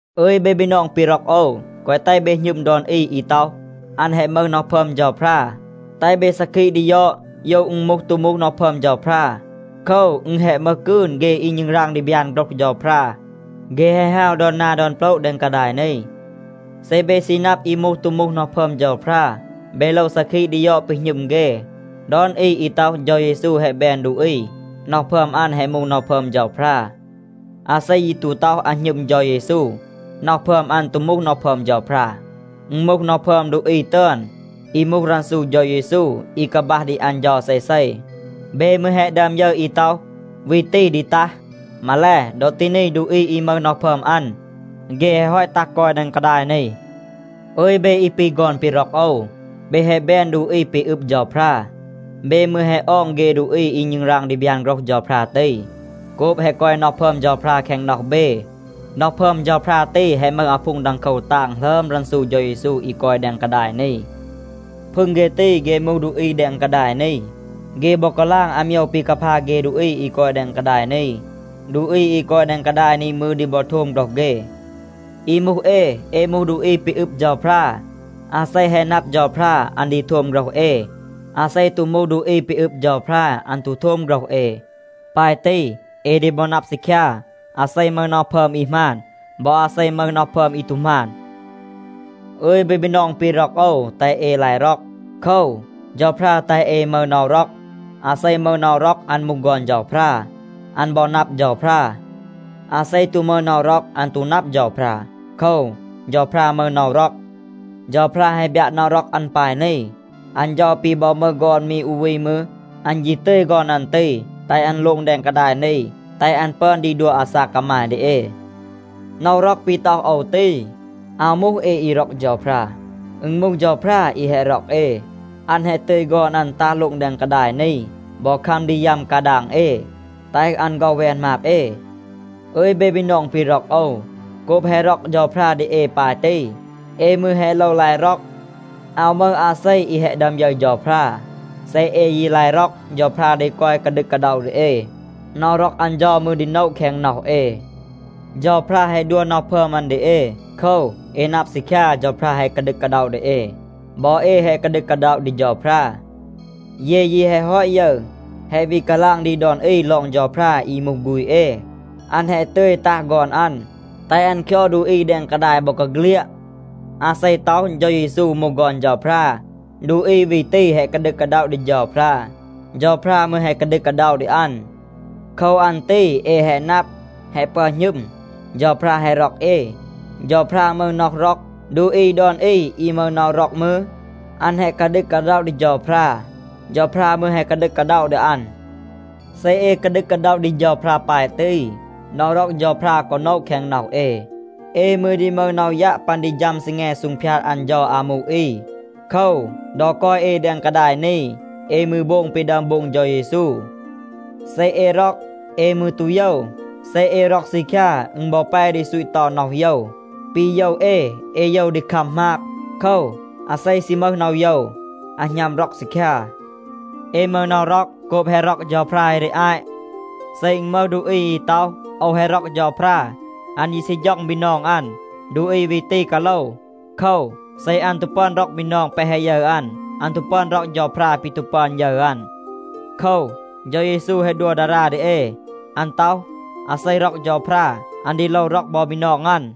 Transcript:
อึย เบ บีนอง ปี ร็อก โอว, แกวะ แตห เบ หณึม ดอน อี อี ต็อห, อัน แฮะ มึห น็อห พึอม เฌาพรา. แตห เบ ซาคีะ ดี ยอด, โยว อึณ มูห ตู มูห น็อห พึอม เฌาพรา. โคว, อึณ แฮะ มึห กืน เฆ อี ณึงราง ดี บยาน โฆรห เฌาพรา. เฆ แฮะ ฮาว ดอน นา ดอน โปละ แดง กาดาย นี. เซ เบ ซี นับ อี มูห ตู มูห น็อห พึอม เฌาพรา, เบ โลว ซาคีะ ดี ยอด ปี หณึม เฆ. ดอน อี อี ต็อห, เฌา เยซู แฮะ แบน ดูอี, น็อห พึอม อัน แฮะ มูห น็อห พึอม เฌาพรา. อาเซ ยี ตู ต็อห, อัน หณึม เฌา เยซู, น็อห พึอม อัน ตู มูห น็อห พึอม เฌาพรา. อึณ มูห น็อห พึอม ดูอี ตึอน, อี มูห รันซู เฌา เยซู, อี กาบัห ดี อัน เฌา เซเซ. เบ มืร แฮะ ดึอม ยึร อี ต็อห, วี ตี ดี ตัห. มาแล, ดอ ตี นี ดูอี อี มึห น็อห พึอม อัน, เฆ แฮะ ฮอต ตัห กอย แดง กาดาย นี. อึย เบ อี ปี ฆอน ปี ร็อก โอว, เบ แฮะ แบน ดูอี ปี อึบ เฌาพรา. เบ มืร แฮะ ออง เฆ ดูอี อี ณึงราง ดี บยาน โฆรห เฌาพรา ตี, โกบ แฮะ กอย น็อห พึอม เฌาพรา แคง น็อห เบ. น็อห พึอม เฌาพรา ตี, แฮะ มึห อาพูง ดังโคว ตาง หลึอม รันซู เฌา เยซู อี กอย แดง กาดาย นี. พึง เฆ ตี, เฆ มูห ดูอี แดง กาดาย นี. เฆ บอ กาลาง อาโมยว ปี กาพา เฆ ดูอี อี กอย แดง กาดาย นี. ดูอี อี กอย แดง กาดาย นี มืร ดี บอ โทม โฆรห เฆ. อี มูห เอ, เอ มูห ดูอี ปี อึบ เฌาพรา. อาเซ แฮะ นับ เฌาพรา, อัน ดี โทม โฆรห เอ. อาเซ ตู มูห ดูอี ปี อึบ เฌาพรา, อัน ตู โทม โฆรห เอ. ปาย ตี, เอ ดี บอ นับ ซีคยา, อาเซ มึห น็อห พึอม อี หมาน บอ อาเซ มึห น็อห พึอม อี ตู หมาน. อึย เบ บีนอง ปี ร็อก โอว, แตห เอ ลาย ร็อก. โคว, เฌาพรา แตห เอ มึห น็อห ร็อก. อาเซ มึห น็อห ร็อก, อัน มูห ฆอน เฌาพรา, อัน บอ นับ เฌาพรา. อาเซ ตู มึห น็อห ร็อก, อัน ตู นับ เฌาพรา. โคว, เฌาพรา มึห น็อห ร็อก. เฌาพรา แฮะ บยัะ น็อห ร็อก อัน ปาย นี. อัน เฌา ปี บอ มึห ฆอน มี อู วี มืร, อัน ยี ตึย ฆอน อัน ตี, แตห อัน โลง แดง กาดาย นี, แตห อัน ปึอน ดี ดัว อาซาก กามาย ดี เอ. น็อห ร็อก ปี ต็อห โอว ตี, อาว มูห เอ อี ร็อก เฌาพรา. อึณ มูห เฌาพรา อี แฮะ ร็อก เอ. อัน แฮะ ตึย ฆอน อัน ตัห โลง แดง กาดาย นี บอ คัม ดี ยัม กาดาง เอ, แตห อัน ฆ็อห แวน หมาบ เอ. อึย เบ บีนอง ปี ร็อก โอว, โกบ แฮะ ร็อก เฌาพรา ดี เอ ปาย ตี, เอ มืร แฮะ โลว ลาย ร็อก. อาว มึห อาเซ อี แฮะ ดึอม ยึร เฌาพรา. เซ เอ ยี ลาย ร็อก, เฌาพรา ดี กอย กาดึก กาด็อะ ดี เอ. น็อห ร็อก อัน เฌา มืร ดี โนะ แคง น็อห เอ. เฌาพรา แฮะ ดัว น็อห พึอม อัน ดี เอ. โคว, เอ นับ ซีคยา, เฌาพรา แฮะ กาดึก กาด็อะ ดี เอ, บอ เอ แฮะ กาดึก กาด็อะ ดี เฌาพรา. เย ยี แฮะ ฮอต ยึร, แฮะ วี กาลาง ดี ดอน อี ลอง เฌาพรา อี มูห ฆูณ เอ, อัน แฮะ ตึย ตัห ฆอน อัน, แตห อัน คยอด ดูอี แดง กาดาย บอกาเฆลียด. อาเซ ต็อห, เฌา เยซู มูห ฆอน เฌาพรา, ดูอี วี ตี แฮะ กาดึก กาด็อะ ดี เฌาพรา. เฌาพรา มืร แฮะ กาดึก กาด็อะ ดี อัน. โคว อัน ตี เอ แฮะ นับ, แฮะ ปึอน หณึม, เฌาพรา แฮะ ร็อก เอ. เฌาพรา มึห น็อห ร็อก. ดูอี ดอน อี อี มึห น็อห ร็อก มืร, อัน แฮะ กาดึก กาด็อะ ดี เฌาพรา. เฌาพรา มืร แฮะ กาดึก กาด็อะ ดี อัน. เซ เอ กาดึก กาด็อะ ดี เฌาพรา ปาย ตี, น็อห ร็อก เฌาพรา กอ โนะ แคง น็อห เอ. เอ มืร ดี มึห น็อห ยัะ ปัน ดี ฌัม ซีแง ดี ซูงพยาด อัน เฌา อามู อี. โคว, ดอ กอย เอ แดง กาดาย นี, เอ มืร โบง ปี ดึอม โบง เฌา เยซู. เซ เอ ร็อก, เอ มืร ตู โยว. เซ เอ ร็อก ซีคยา, อึณ บอ แป ดี ซูต เตา น็อห โยว. ปี โยว เอ, เอ โยว ดี คัม หมาบ. โคว, อาเซ ซี มึห น็อห โยว, อัน หณัม ร็อก ซีคยา. เอ มึห น็อห ร็อก โกบ แฮะ ร็อก เฌาพรา เอ ดี อาต. เซ อึณ มึห ดูอี อี ต็อห, “โอว แฮะ ร็อก เฌาพรา.” อัน ยี ซี ฌ็อง บีนอง อัน, ดูอี วี ตี กาโลว. โคว, เซ อัน ตู ปึอน ร็อก บีนอง แปะ แฮะ ยึร อัน, อัน ตู ปึอน ร็อก เฌาพรา ปี ตู ปึอน ยึร อัน. โคว, เฌา เยซู แฮะ ดัว ดารา ดี เอ. อัน ต็อห, อาเซ ร็อก เฌาพรา, อัน ดี โลว ร็อก บอ บีนอง อัน.